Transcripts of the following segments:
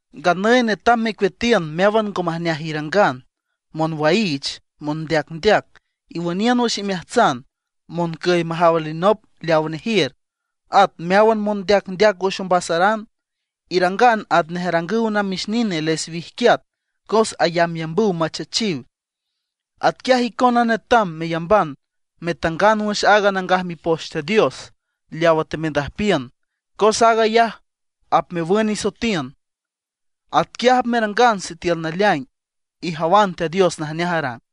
Nganüy netam mecueatiün meáwan ngo majneaj irangan: monwaiich, mondeacndeac iwüniünan wüx imeajtsan, moncüy majaw alinop leaw nejiür, at meáwan mondeacndeac wüx ombasaran. Irangan atnej arangüw namix nine les wijquiat cos ayambyambüw machech. Atquiaj icona netam meyamban metangan wüx aaga Nangaj Mipoch Teat Dios leawa temendüjpiün, cos aag ayaj apmewün isoetiün. Atquiaj apmerangan sitiül naleaing ijawan Teat Dios najneaj arang.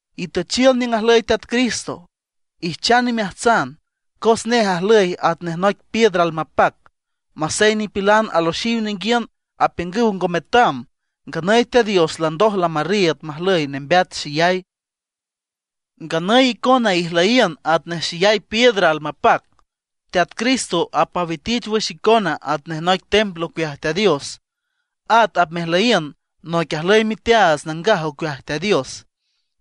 Itüchiün niüng ajlüy Teat Cristo, ijchan imeajtsan, cos nej ajlüy atnej noic piedra almapac. Masey nipilan aloxiw ninguiün, apiüngüw ngo metam. Nganüy Teat Dios landoj lamarriiüd majlüy nembeat xeyay. Nganüy icona ijlüyiün atnej xeyay piedras almapac. Teat Cristo apmawitich wüx icona atnej noic templo ocueaj Teat Dios; at apmejlüyiün noic ajlüy miteaats nangaj ocueaj Teat Dios,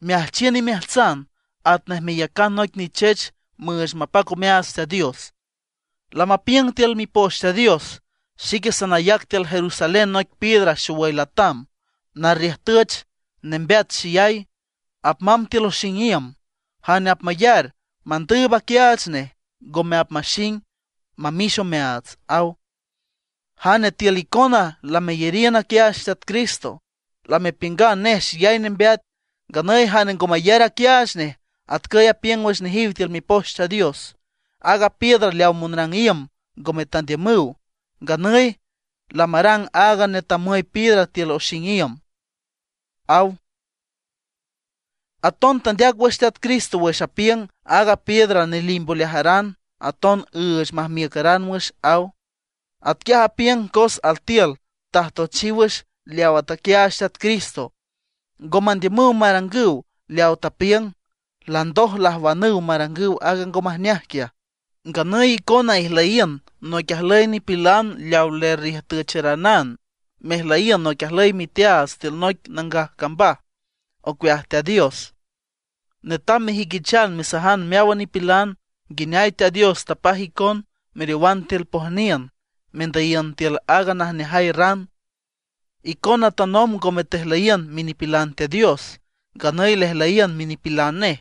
meajchiün imeajtsan atnej meyacan noic nichech müüch mapac omeaats Teat Dios. Lamapiüng tiül Mipoch Teat Dios: Xique sanayac tiül Jerusalén noic piedra xowüy latam, narriüjtüch, nembeat xeyay, apmamb tiül oxing iüm. Jane apmayar, mandüüb aquiaach nej, ngome apmaxing, mamix omeaats, aw. Jane tiül icona lameyariün aquiaach Teat Cristo, lamepiüngan nej xeyay nembeat. Nganüy jane ngo mayar aquiaach nej, atcüy apiüng wüx nejiw tiül Mipoch Teat Dios: Aaga piedra leaw monrang iüm ngome tandiümüw; nganüy lamarang aaga netamüy piedra tiül oxing iüm, aw. Aton tandeac wüx Teat Cristo wüx apiüng: Aaga piedra nelimb oleajaran, aton üüch majmiücaran wüx, aw. Atquiaj apiüng cos altiül ajtoechiw wüx leawa taquiaach Teat Cristo, ngo mandiümüw marangüw leawa tapiüng, landoj lajwanüw marangüw aaga ngo majneaj quiaj. Nganüy icona ijlüyiün noic ajlüy nipilan leaw lerriüjtücharanan mejlüyiün noic ajlüy miteaats tiül noic nangaj cambaj ocueaj Teat Dios. Netam mejüiquichan mesajan meáwan nipilan nguineay Teat Dios tapaj icon meriowan tiül pojniün, mendüyiün tiül aaga najneajay ran. Icona tanomb ngome tejlüyiün minipilan Teat Dios; nganüy lejlüyiün minipilan nej.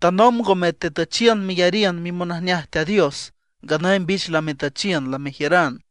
Tanomb ngome tetüchiün meyariün mimonajneaj Teat Dios; nganüy mbich lametüchiün, lamejiüran.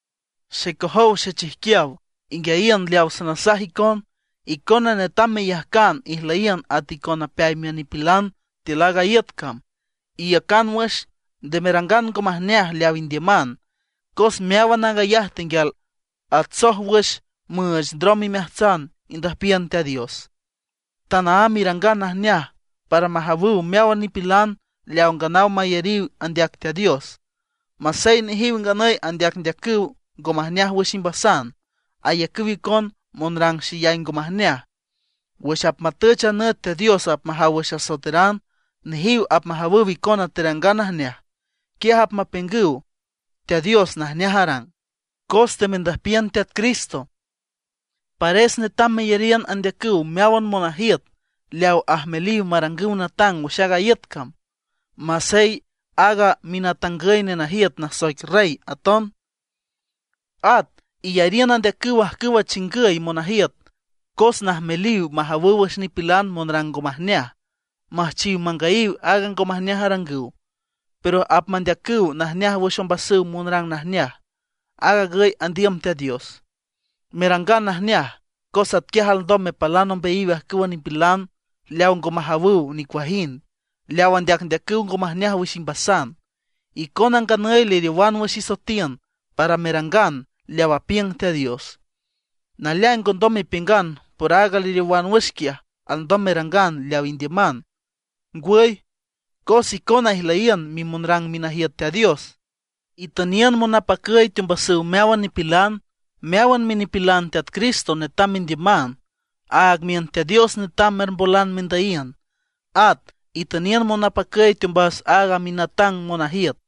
Xecojow xechijquiaw, inguiayiün leawa sanasaj icon. Icona netam meyajcan ijlüyiün at icon napeay miün nipilan tiül aaga iüt cam. Iiücan wüx, nde merangan ngo majneaj leaw indiüman. Cos meáwan aag ayaj tenguial atsoj wüx müüch ndrom imeajtsan indüjpiün Teat Dios. Tanaámb irangan najneaj para majawüw meáwan nipilan leaw nganaw mayariw andeac Teat Dios. Masey nejiw nganüy andeacndeacüw ngo majneaj wüx imbasan, ayacüw icon monrang xeyay ngo majneaj. Wüx apmatüch a nüt Teat Dios apmajaw wüx asoeteran, nejiw apmajawüw icona terangan najneaj. Quiaj apmapiüngüw Teat Dios najneaj arang. Cos temendüjpiün Teat Cristo, pares netam meyariün andeacüw meáwan monajiüt leaw ajmeliw marangüw natang wüx aaga iüt cam, masey aaga minatangüy nenajiüt nasoic rey aton. At iyariün andeacüw ajcüwa chingüy monajiüt cos najmeliw majawüw wüx nipilan monrang ngo majneaj, müjchiw mangüyiw aaga ngo majneaj arangüw; pero apmandeacüw najneaj wüx ombasüw monrang najneaj. Aag agüy andiüm Teat Dios: merangan najneaj, cos atquiaj alndom mepalan ombeayiw ajcüwa nipilan leaw ngo majawüw nicuajind, leaw andeacndeacüw ngo majneaj wüx imbasan. Icona nganüy leriowan wüx isoetiün para merangan leaw apiüng Teat Dios. Naleaing ngondom mepiüngan por aaga leriowan wüx quiaj alndom merangan leaw indiüman. Ngwüy, cos icona ijlüyiün mimonrang minajiüt Teat Dios. Itüniün monapacüy teombasüw meáwan nipilan. Meáwan minipilan Teat Cristo netam mendiüman. Aag miün Teat Dios netam merbolan mendüyiün. At itüniün monapacüy teombas aaga minatang monajiüt.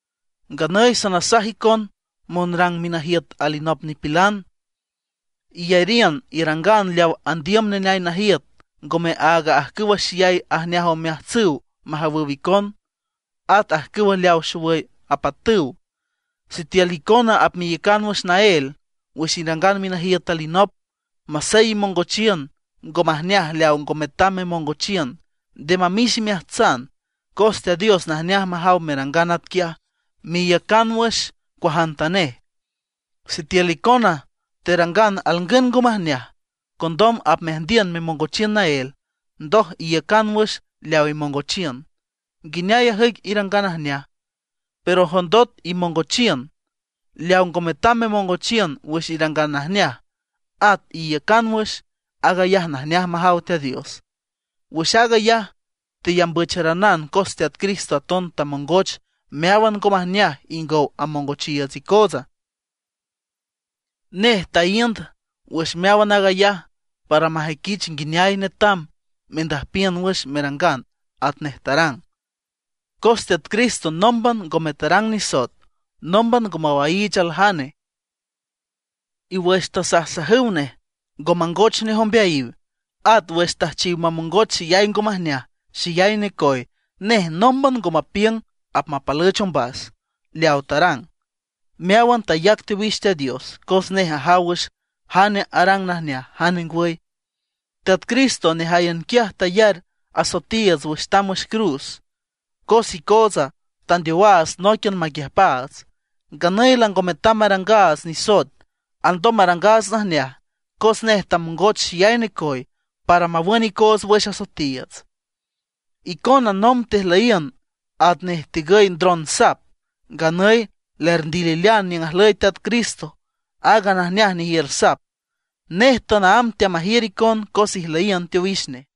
Nganüy sanasaj icon monrang minajiüt alinop nipilan: iyariün irangan leaw andiüm neneay najiüt, ngome áagan ajcüwa xeyay ajneaj omeajtsüw majawüw icon, at ajcüw leawa xowüy apatüw. Sitiül icona apmeiücan wüx naél wüx irangan minajiüt alinop, masey imongochiün ngo majneaj leaw ngo metam memongochiün, nde mamix imeajtsan, cos Teat Dios najneaj majaw merangan atquiaj, meiücan wüx cuajantanej. Sitiül icona terangan alngün ngo majneaj, condom apmeajndiün memongochiün naél, ndoj iiücan wüx leaw imongochiün, ¿nguineay ajüic irangan najneaja? Pero jondot imongochiün leaw ngo metam memongochiün wüx irangan najneaj, at iiücan wüx, aag ayaj najneaj majaw Teat Dios. Wüx aag ayaj teyambücharanan cos Teat Cristo aton tamongoch meáwan ngo majneaj ingow amongochiiüts icootsa. Nej taíünd wüx meáwan aag ayaj para majüiquich nguineay netam mendüjpiün wüx merangan atnej tarang. Cos Teat Cristo nómban ngome tarang nisoet, nómban ngo mawaiich aljane; y wüx tasajsajüw nej, ngo mangoch nej ombeayiw; at wüx tüjchiw mamongoch xeyay ngo majneaj, xeyay necoy, nej nómban ngo mapiüng apmapalüch ombas. Leawa tarang, meáwan tayac teowix Teat Dios, cos nej ajaw wüx jane arang najneaj jane ngwüy. Teat Cristo nejáyan quiaj tayar asoetiiüts wüx tamb wüx cruz, cos icootsa tandeowaats nóiquian maquiüjpaats; nganüy lango metam marangaats nisoet, alndom marangaats najneaj. Cos nej tamongoch xeyay necoy para mawün icoots wüx asoetiiüts. Icona nomb tejlüyiün atnej tigüy ndron sap; nganüy lerndililean niüng ajlüy Teat Cristo aaga najneaj nejiür sap; nej tanaámb teamajiür icon cos ijlüyiün teowix nej.